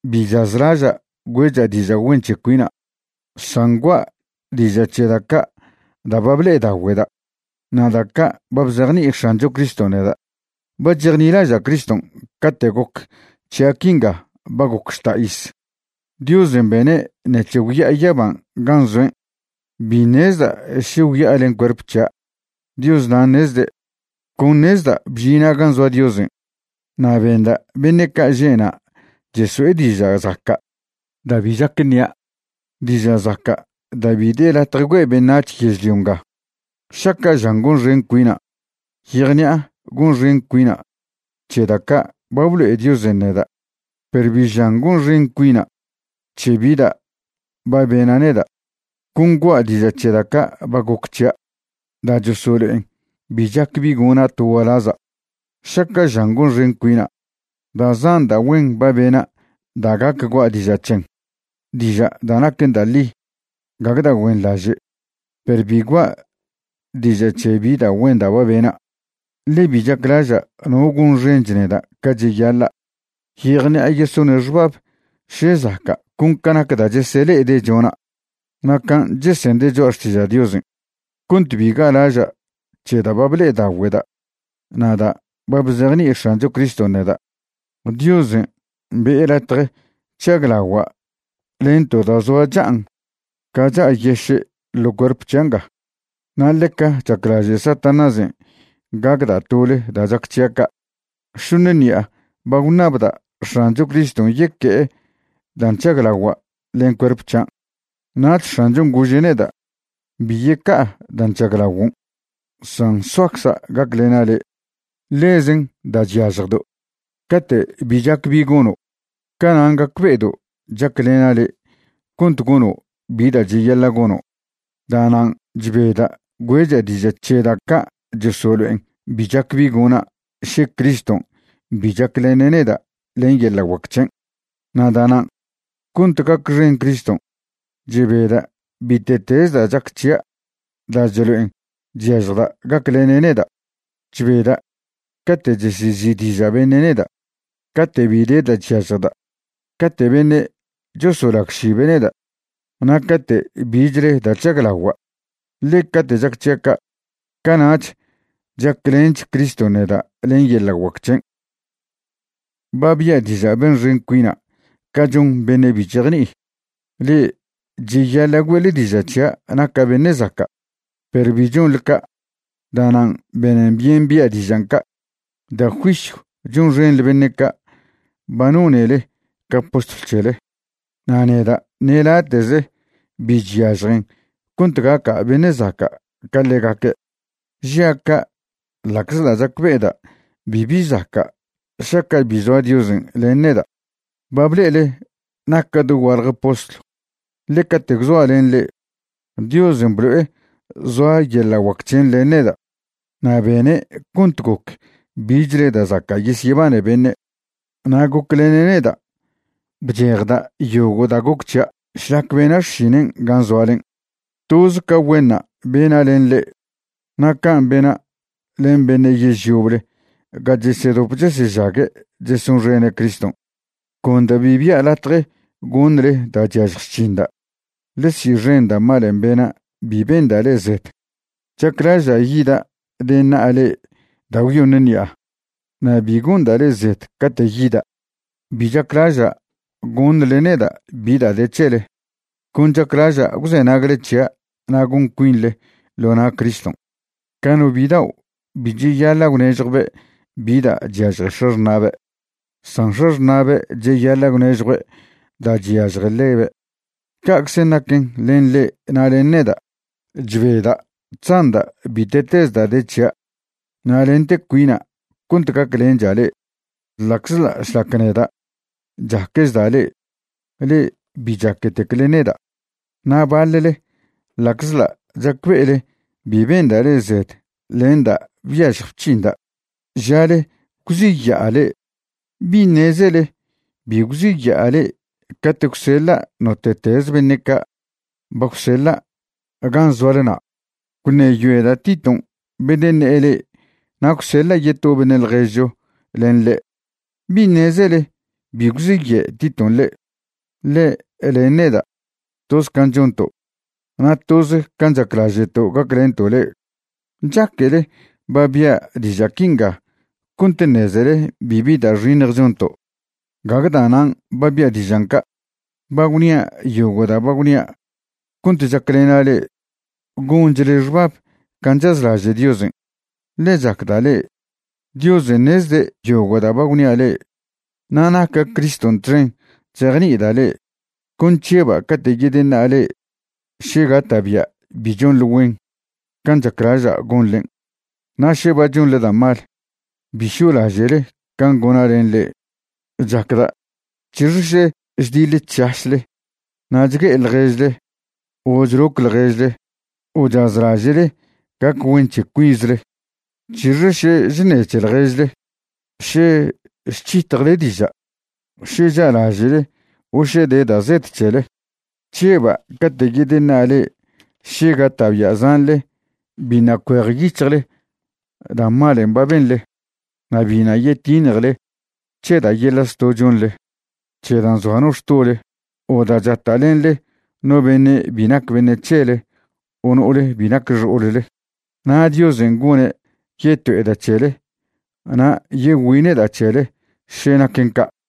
Bi chazlaža' güe'cha' diža' güen c̱he cuina', san gua' diža' c̱he da' ca' da' ba ble'edagüe'da' na' da' ca' ba bzejni'i X̱ancho Criston' neda'. Ba chejnilaža' Criston' cate' goc c̱hia' quinga ba goc žta' iz. Diosen' bene' ṉec̱he gwya'a yaban' gan' zoen'. Bi ṉezda' še gwya'a len cuerp c̱hia', Dios nan' ṉezde'. Con ṉezda' bžina' gan' zoa Diosen' na' benda' beṉe' ca' že' na' cheso'e diža' zaca' da' bi chac ṉia', diža' zaca' da' bi de latje güe' beṉac̱h yežlio nga. Šaca' žan gonxen cuina', yejṉi'a gonxen cuina' c̱he da' ca' ba blo'e Diosen' neda', perw bi žan gonxen cuina' c̱he bi da' ba bena' neda'. Con gua' diža' c̱he da' ca' ba goc c̱hia' da' chosolo'en bi chac bi gona' to gualaza'. Šaca' žan gonxen cuina', da' zan da' güen ba bena' da' gac gua' diža' c̱hen, diža' da' naquen da' ḻi, gague da' güenḻaže'. Perw bi gua' diža' c̱he bi da' güen da' ba bena', ḻe bi chaclaža' no gonxench neda' ca cheyaḻa'. Yejṉi'a yesone' xbab še zaca' con ca nac da' chesele'ede' chona' na' can' chesende' choa' xtiža' Diosen'. Cont bi ga'laža' c̱he da' ble'edagüe'da' na' da' ba bzejni'i X̱ancho Criston' neda', Diosen' be'e latje chžaglagua' len to da' zoa cha'an ca cha'a yeše' ḻo cuerp c̱hia' nga, na' ḻeca chaclaže' Satanásen' gacda' tole da' chac c̱hia' ca'. Šoṉe ṉi'a ba gwṉabda' X̱ancho Criston' yeque'e dan' chžaglagua' len cuerp c̱hian'. Nach X̱anchon' gože' neda': “Bi yeca'a dan' chžaglaguon', san soacza' gaclena' le'. Ḻezen da' chyažjdo'. Cate' bi chac bi gono', canan' gacbe'edo' chaclena' le' cont gono' bi da' cheyaḻa' gono'.” Da'nan' chbeda' güe'cha' diža' c̱he da' ca' chosolo'en bi chac bi gona' še Criston' bi chaclene' neda' len yeḻa' guac c̱hen'. Na' da'nan', cont gacxen Criston', chbeda' bite'teze da' chac c̱hia' da' chlo'en chyažjda' gaclene' neda'. Chbeda' cate' chesezi'diža' beṉe' neda', cate' bi de da' chyažjda', cate' beṉe' chosolagšibe' neda', na' cate' bichle da' chžaglagua', ḻe cate' chac c̱hia' ca', cana'ch chaclench Criston' neda' len yeḻa' guac c̱hen'. Ba bia' diža' benxen cuina' ca chon beṉe' bi chejni'i. Le'e cheyaḻa' güe'le diža' c̱hia' naca' beṉe' zaca', perw bi chonḻe ca'. Da'nan' benen byen bia' dižan' ca'. Da' juisyw chonxenḻe beṉe' ca' ba nonele ca postlw c̱hele. Na' neda' ṉe late'ze bi chyažjen cont gaca' beṉe' zaca' ca ḻegaque'. Žia' ca' ḻa'czḻa' chacbe'eda' bibi zaca' šaca' bi zoa Diosen' len neda'. Ba ble'ele naca' dogualje postlw, ḻe cate' gwzoa' len le'e, Diosen' blo'e zoa yeḻa' guac c̱hen' len neda' na' bene' cont goc bichle da' zaca' yesyebane beṉe', na' goclene' neda' bchejda' yogo' da' goc c̱hia' šlac bena' xšinen' gan' zoalen'. Toze ca güenṉa' bena' len le'e na' can' bena' len beṉe' yež yoble ga chesedop chesežague' chesonxene' Criston', con da' bi bia' latje goṉle da' chyažj chc̱hinda'. Ḻe si'xen da' malen' bena' bi benda' le'e zed. Chaclaža' yida' deṉa'a le'e da' gwyoṉe ṉi'a. Na' bi gonda' le'e zed cate' yida'. Bi chaclaža' goṉle neda' bi da' de c̱hele, con chaclaža' gwzenagle c̱hia' na' gon cuinḻe ḻo na' Criston'. Ca no bidao' bi cheyaḻa' gwnežjwbe' bi da' chyažje x̱axṉa'be', san x̱axṉa'be' cheyaḻa' gwnežjue' da' chyažje ḻebe', ca'czen' naquen len le'e na' len neda'. Chbeda' chzanda' bite'teze da' de c̱hia' na' lente cuina' cont gaclencha' le'e, ḻa'czḻa' šlac neda' chaquechda' le'e, le'e bi chaquetecle neda'. Na' baḻle, ḻa'czḻa' chacbe'ele bi benda' le'e zed len da' byažj bc̱hinda', žale gwziya'a le'e. ¿Bi ṉezele bi gwziya'a le'e cate' gwseḻa' note'teze beṉe' ca' ba gwseḻa' gan' zoale na'? Gwṉeyoeda' Titon' bedeṉe'e le'e na' gwseḻa' yeto beṉe' ḻježcho len ḻe'. ¿Bi ṉezele bi gwziye' Titon' le'e? Ḻe' len neda', toz can' chonto', na' toz can' chaclaže'to' gaclento' le'e. ¿Chaquele ba bia' diža' quinga cont ṉezele bibi da' xiṉj chonto'? Gague da'nan' ba bia' dižan' ca'. Ba gwnia' yogo' da' ba gwnia' cont chaclena' le'e gonchle xbab can' chazlaže' Diosen', ḻe chacda' le'e. Diosen' ṉezde' yogo' da' ba gwnia' le'e, na' naca' Criston' txen chzejni'ida' le'e. Con chžeba' cate' yedeṉa'a le'e še gata'bia' bi chonḻe güen can' chaclaža' gonḻen', na' še ba chonḻe da' mal, bi šo'laže'le can' gona' len le'e. Chacda' c̱hixe še chdiḻe chšašle na' chgue'e ḻježle o chloc ḻježle o chazlaže'le gac güen c̱he cuinzle. C̱hixe še chṉe c̱he ḻježle, še chc̱hitjle diža', še cha'laže'le o še de da' zed c̱hele. Chžeba' cate' yedyeṉa'a le'e še gata'bia' zanḻe biṉa' cuejyic̱hjle da' malen' ba benḻe, na' biṉa' yetiṉjele c̱he da' yeḻa' zto' chonḻe, c̱he da' nzoa no xtole, o da' chata'lenḻe no beṉe' bi nac beṉe' c̱hele o no'ole bi nac xo'olle. Na' Diosen' gone' yeto'eda' c̱hele na' yegüine'da' c̱hele še naquen ca'.